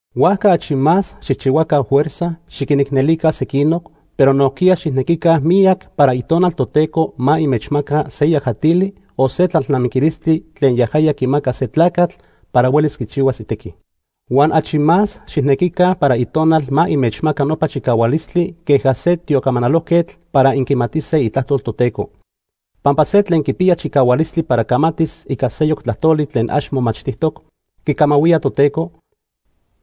Huajca achi más xijchihuaca fuerza xiquinicnelica sequinoc, pero nojquiya xijnequica miyac para Itonal Toteco ma inmechmaca se yajatili o se tlalnamiquilistli tlen yajaya quimaca se tlacatl para huelis quichihuas itequi. Huan achi más xijnequica para Itonal ma inmechmaca nopa chicahualistli queja se tiocamanalojquetl para incamatise itlajtol Toteco. Pampa se tlen quipiya chicahualistli para camatis ica seyoc tlajtoli tlen ax momachtijtoc, quicamahuía Toteco,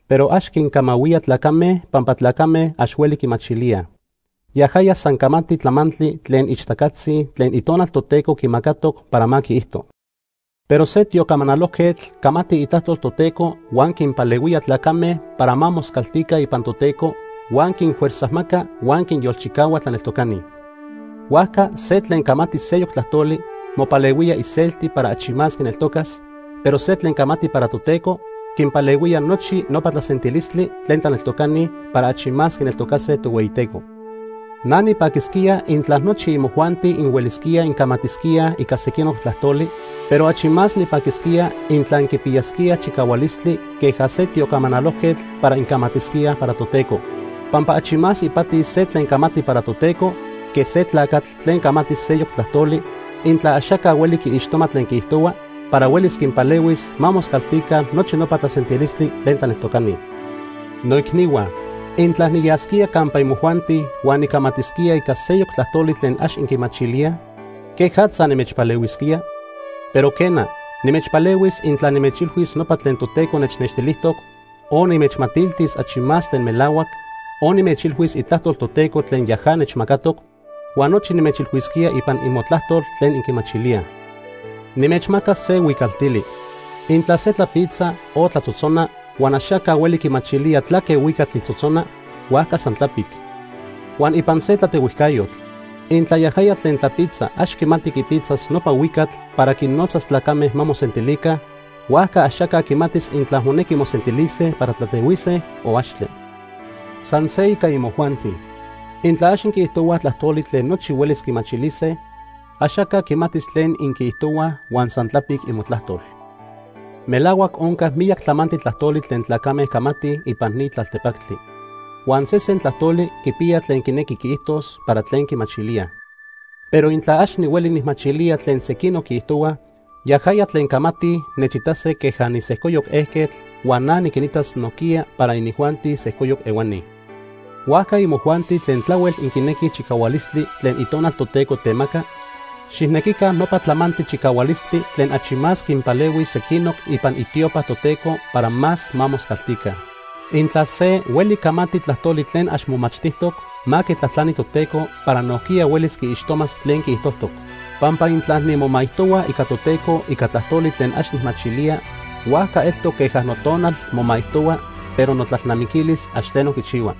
pero ax quincamahuía tlacame pampa tlacame ax hueli quimachilíaj. Yajaya san camati tlamantli tlen ixtacatzi tlen Itonal Toteco quimacatoc para ma quiijto. Pero se tiocamanalojquetl camati itlajtol Toteco huan quinpalehuía tlacame para ma moscaltica ipan Toteco, huan quinfuerzajmaca huan quinyolchicahua tlaneltocani. Huajca se tlen camati seyoc tlajtoli, mopalehuía iselti para achi más quineltocas, pero se tlen camati para Toteco, quinpalehuía nochi nopa tlasentilistli tlen tlaneltocani para achi más quineltocase Tohueyiteco. Na nipaquisquía intla nochi imojuanti inhuelisquíaj incamatisquíaj ica sequinoc tlajtoli, pero achi más nipaquisquía intla inquipiyasquíaj chicahualistli queja se tiocamanalojquetl para incamatisquíaj para Toteco. Pampa achi más ipati se tlen camati para Toteco que se tlacatl tlen camati seyoc tlajtoli intla axaca hueli quiixtoma tlen quiijtohua para huelis quinpalehuis ma moscaltica nochi nopa tlasentilistli tlen tlaneltocani. Noicnihua, intla niyasquía campa imojuanti huan nicamatisquía ica seyoc tlajtoli tlen ax inquimachilíaj, ¿quejatza nimechpalehuisquía? Pero quena, nimechpalehuis intla nimechilhuis nopa tlen Toteco nechnextilijtoc, o nimechmatiltis achi más tlen melahuac, o nimechilhuis itlajtol Toteco tlen yaja nechmacatoc, huan nochi nimechilhuisquía ipan imotlajtol tlen inquimachilíaj. Nimechmacas se huicaltili. Intla se tlapitza o tlatzotzona, huan axaca hueli quimachilía tlaque huicatl quitzotzona, huajca san tlapic. Huan ipan se tlatehuijcayotl intla yajaya tlen tlapitza ax quimati quipitzas nopa huicatl para quinnotzas tlacame ma mosentilica, huajca axaca quimatis intla monequi mosentilise para tlatehuise, o axtle. San se ica imojuanti. Intla ax inquiijtohuaj tlajtoli tlen nochi huelis quimachilise, axaca quimatis tlen inquiijtohuaj huan san tlapic imotlajtol. Melahuac onca miyac tlamantli tlajtoli tlen tlacame camatij ipan ni tlaltepactli. Huan sesen tlajtoli quipiya tlen quinequi quiijtos para tlen quimachilíaj. Pero intla ax nihueli nijmachilía tlen sequinoc quiijtohuaj, yajaya tlen camatij nechitase queja nisejcoyoc ejquetl huan na niquinitas nojquiya para inijuanti sejcoyoc ehuani. Huajca imojuanti tlen tlahuel inquinequij chicahualistli tlen Itonal Toteco temaca, xijnequica nopa tlamantli chicahualistli tlen achi más quinpalehuis sequinoc ipan itiopa Toteco para más ma moscaltica. Intla se hueli camati tlajtoli tlen ax momachtijtoc, ma quitlajtlani Toteco para nojquiya huelis quiixtomas tlen quiijtojtoc. Pampa intla nimomaijtohua ica Toteco ica tlajtoli tlen ax nijmachilía, huajca eltoc queja notonal momaijtohua pero notlalnamiquilis ax tleno quichihua.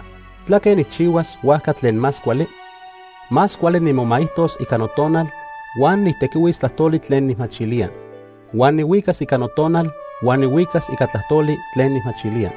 ¿Tlaque nijchihuas huajca tlen más cuali? Más cuali nimomaijtos ica notonal huan nijtequihuis tlajtoli tlen nijmachilía. Huan nihuicas ica notonal huan nihuicas ica tlajtoli tlen nijmachilía.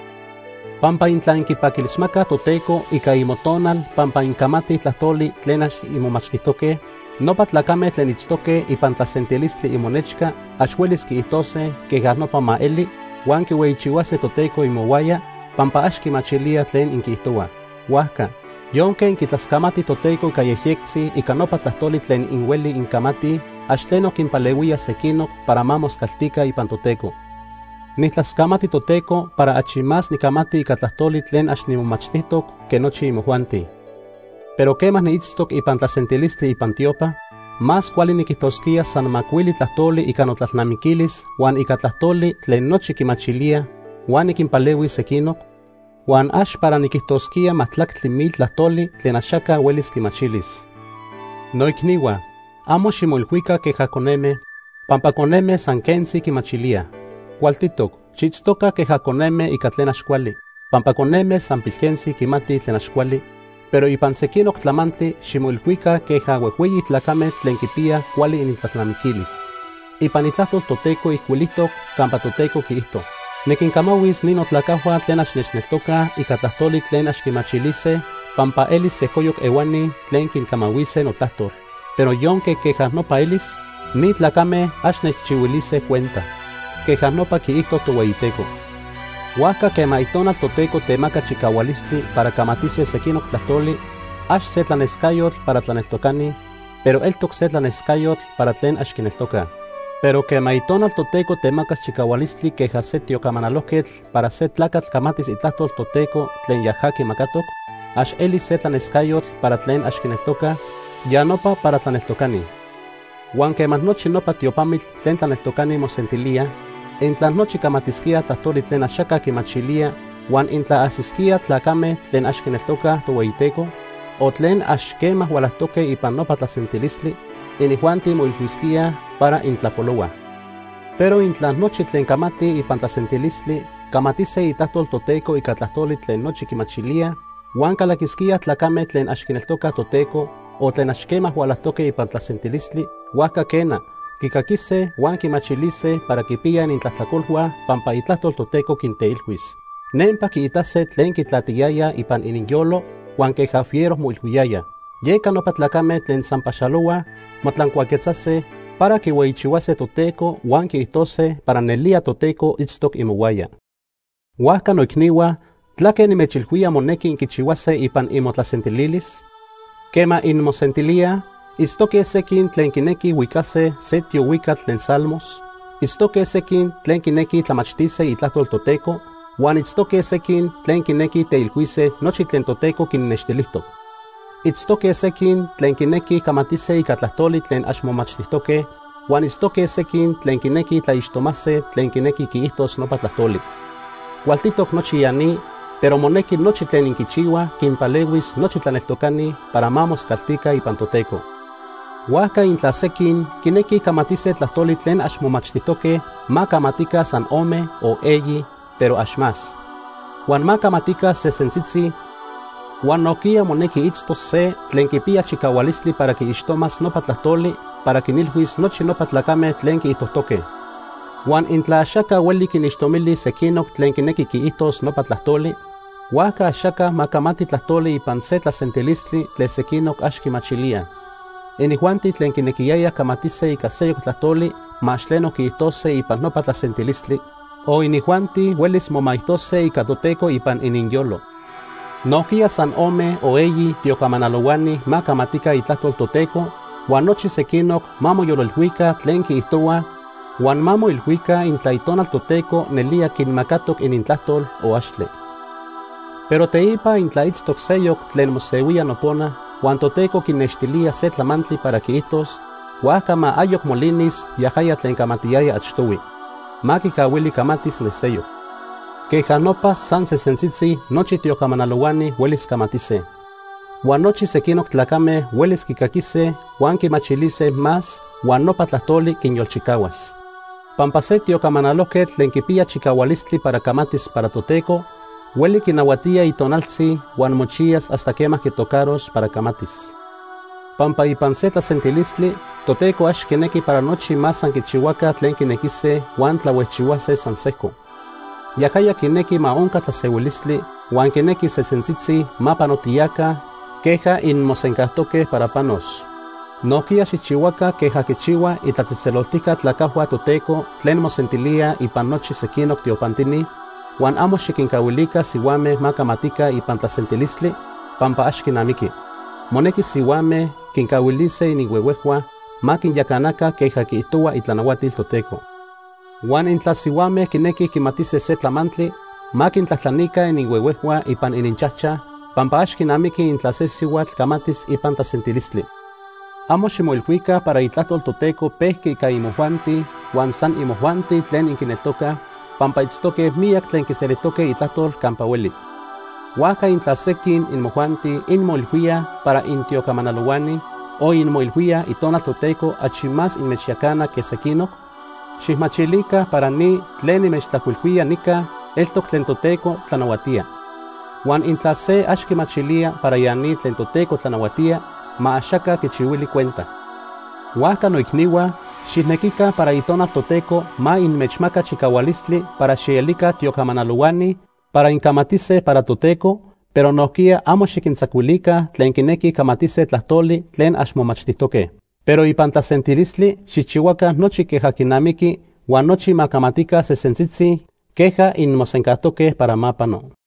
Pampa intla inquipaquilismacaj Toteco ica imotonal pampa incamatij tlajtoli tlen ax inmomachtijtoque, nopa tlacame tlen itztoque ipan tlasentilistli imonechca ax huelis quiijtose: “Queja nopa ma eli”, huan quihueyichihuase Toteco imohuaya, pampa ax quimachilíaj tlen inquiijtohuaj. Huajca, yonque inquitlascamatij Toteco ica yejyectzi ica nopa tlajtoli tlen inhuelij incamatij, ax tleno quinpalehuía sequinoc para ma moscaltica ipan Toteco. Nijtlascamati Toteco para achi más nicamati ica tlajtoli tlen ax nimomachtijtoc que nochi imojuanti. Pero quema niitztoc ipan tlasentilistli ipan tiopa, más cuali niquijtosquía san macuili tlajtoli ica notlalnamiquilis huan ica tlajtoli tlen nochi quimachilíaj huan niquinpalehuis sequinoc, huan ax para niquijtosquía majtlactli mil tlajtoli tlen axaca huelis quimachilis. Noicnihua, amo ximoilhuica queja coneme, pampa coneme san se quentzi quimachilíaj. Cualtitoc xiitztoca queja coneme ica tlen ax cuali, pampa coneme san pilquentzi quimatij tlen ax cuali, pero ipan sequinoc tlamantli ximoilhuica queja huejhueyi tlacame tlen quipiyaj cuali inintlalnamiquilis. Ipan Itlajtol Toteco ijcuilijtoc campa Toteco quiijto: “Niquincamahuis ni notlacajhua tlen ax nechneltocaj ica tlajtoli tlen ax quimachilise, pampa elis sejcoyoc ehuani tlen quincamahuise notlajtol, pero yonque queja nopa elis, ni tlacame ax nechchihuilise cuenta.” Queja nopa quiijto Tohueyiteco. Huajca quema Itonal Toteco temaca chicahualistli para camatise sequinoc tlajtoli, ax se tlanescayotl para tlaneltocani, pero eltoc se tlanescayotl para tlen ax quineltocaj. Pero quema Itonal Toteco temacas chicahualistli queja se tiocamanalojquetl para se tlacatl camatis itlajtol Toteco tlen yaja quimacatoc, ax elis se tlanescayotl para tlen ax quineltocaj, ya nopa para tlaneltocani. Huan quema nochi nopa tiopamitl tlen tlaneltocani mosentilíaj, intla nochi camatisquíaj tlajtoli tlen axaca quimachilía, huan intla ajsisquíaj tlacame tlen ax quineltocaj Tohueyiteco, o tlen ax quema hualajtoque ipan nopa tlasentilistli, inijuanti moilhuisquíaj para intlapolohuaj. Pero intla nochi tlen camatij ipan tlasentilistli, camatise itlajtol Toteco ica tlajtoli tlen nochi quimachilíaj, huan calaquisquíaj tlacame tlen ax quineltocaj Toteco, o tlen ax quema hualajtoque ipan tlasentilistli, huajca quena, quicaquise huan quimachilise para quipiyaj inintlajtlacolhua pampa itlajtol Toteco quinteilhuis. Nempa quiitase tlen quitlatiyayaj ipan ininyolo huan queja fiero moilhuiyayaj. Yeca nopa tlacame tlen san paxalohuaj motlancuaquetzase para quihueyichihuase Toteco huan quiijtose para nelía Toteco itztoc imohuaya. Huajca noicnihua, ¿tlaque nimechilhuía monequi inquichihuase ipan imotlasentilis? Quema inmosentilíaj, itztoque sequin tlen quinequij huicase se tiohuicatl tlen Salmos, itztoque sequin tlen quinequij tlamachtise Itlajtol Toteco, huan itztoque sequin tlen quinequij teilhuise nochi tlen Toteco quinnextilijtoc. Itztoque sequin tlen quinequij camatise ica tlajtoli tlen ax momachtijtoque, huan itztoque sequin tlen quinequij tlaixtomase tlen quinequi quiijtos nopa tlajtoli. Cualtitoc nochi ya ni, pero monequi nochi tlen inquichihuaj quinpalehuis nochi tlaneltocani para ma moscaltica ipan Toteco. Huajca intla sequin quinequij camatise tlajtoli tlen ax momachtijtoque, ma camatica san ome o eyi, pero ax más. Huan ma camatica sesentzitzi, huan nojquiya monequi itztos se tlen quipiya chicahualistli para quiixtomas nopa tlajtoli para quinilhuis nochi nopa tlacame tlen quiijtojtoque. Huan intla axaca hueli quinixtomilis sequinoc tlen quinequi quiijtos nopa tlajtoli, huajca axaca ma camati tlajtoli ipan se tlasentilistli tlen sequinoc ax quimachilíaj. Inijuanti tlen quinequiyayaj camatise ica seyoc tlajtoli ma ax tleno quiijtose ipan nopa tlasentilistli, o inijuanti huelis momaijtose ica Toteco ipan ininyolo. Nojquiya san ome o eyi tiocamanalohuani ma camatica itlajtol Toteco, huan nochi sequinoc ma moyolilhuica tlen quiijtohuaj huan ma moilhuica intla Itonal Toteco nelía quinmacatoc inintlajtol o axtle. Pero teipa intla itztoc seyoc tlen mosehuía nopona huan Toteco quinextilía se tlamantli para quiijtos, huajca ma ayoc molinis yajaya tlen camatiyaya achtohui. Ma quicahuili camatis ne seyoc. Queja nopa, san sesentzitzi, nochi tiocamanalohuani huelis camatise. Huan nochi sequinoc tlacame huelis quicaquise huan quimachilise más huan nopa tlajtoli quinyolchicahuas. Pampa se tiocamanalojquetl tlen quipiya chicahualistli para camatis para Toteco, hueli quinahuatía itonaltzi huan mochiyas hasta quema quitocaros para camatis. Pampa ipan se tlasentilistli, Toteco ax quinequi para nochi ma san quichihuaca tlen quinequise huan tlahuejchihuase san sejco. Yajaya quinequi ma onca tlasehuilistli huan quinequi sesentzitzi ma panotiyaca queja inmosencajtoque para panos. Nojquiya xijchihuaca queja quichihuaj itlatzejtzeloltijca tlacajhua Toteco tlen mosentilíaj ipan nochi sequinoc tiopantini, huan amo xiquincahuilica sihuame ma camatica ipan tlasentilistli pampa ax quinamiqui. Monequi sihuame quincahuilise ininhuehuejhua ma quinyacanaca queja quiijtohuaj itlanahuatil Toteco. Huan intla sihuame quinequij quimatise se tlamantli, ma quintlajtlanica ininhuehuejhua ipan ininchajchaj, pampa ax quinamiqui intla se sihuatl camatis ipan tlasentilistli. Amo ximoilhuica para Itlajtol Toteco pejqui ica imojuanti huan san imojuanti tlen inquineltocaj, pampa itztoque miyac tlen quiselijtoque itlajtol campa hueli. Huajca intla sequin imojuanti inmoilhuíaj para intiocamanalohuani, o inmoilhuíaj Itonal Toteco achi más inmechyacana que sequinoc, xijmachilica para ni tlen nimechtlajcuilhuía nica eltoc tlen Toteco tlanahuatía. Huan intla se ax quimachilía para ya ni tlen Toteco tlanahuatía, ma axaca quichihuili cuenta. Huajca noicnihua, xijnequica para Itonal Toteco ma inmechmaca chicahualistli para xielica tiocamanalohuani para incamatise para Toteco, pero nojquiya amo xiquintzacuilica tlen quinequij camatise tlajtoli tlen ax momachtijtoque. Pero ipan tlasentilistli xijchihuaca nochi queja quinamiqui huan nochi ma camatica sesentzitzi queja inmosencajtoque para ma pano.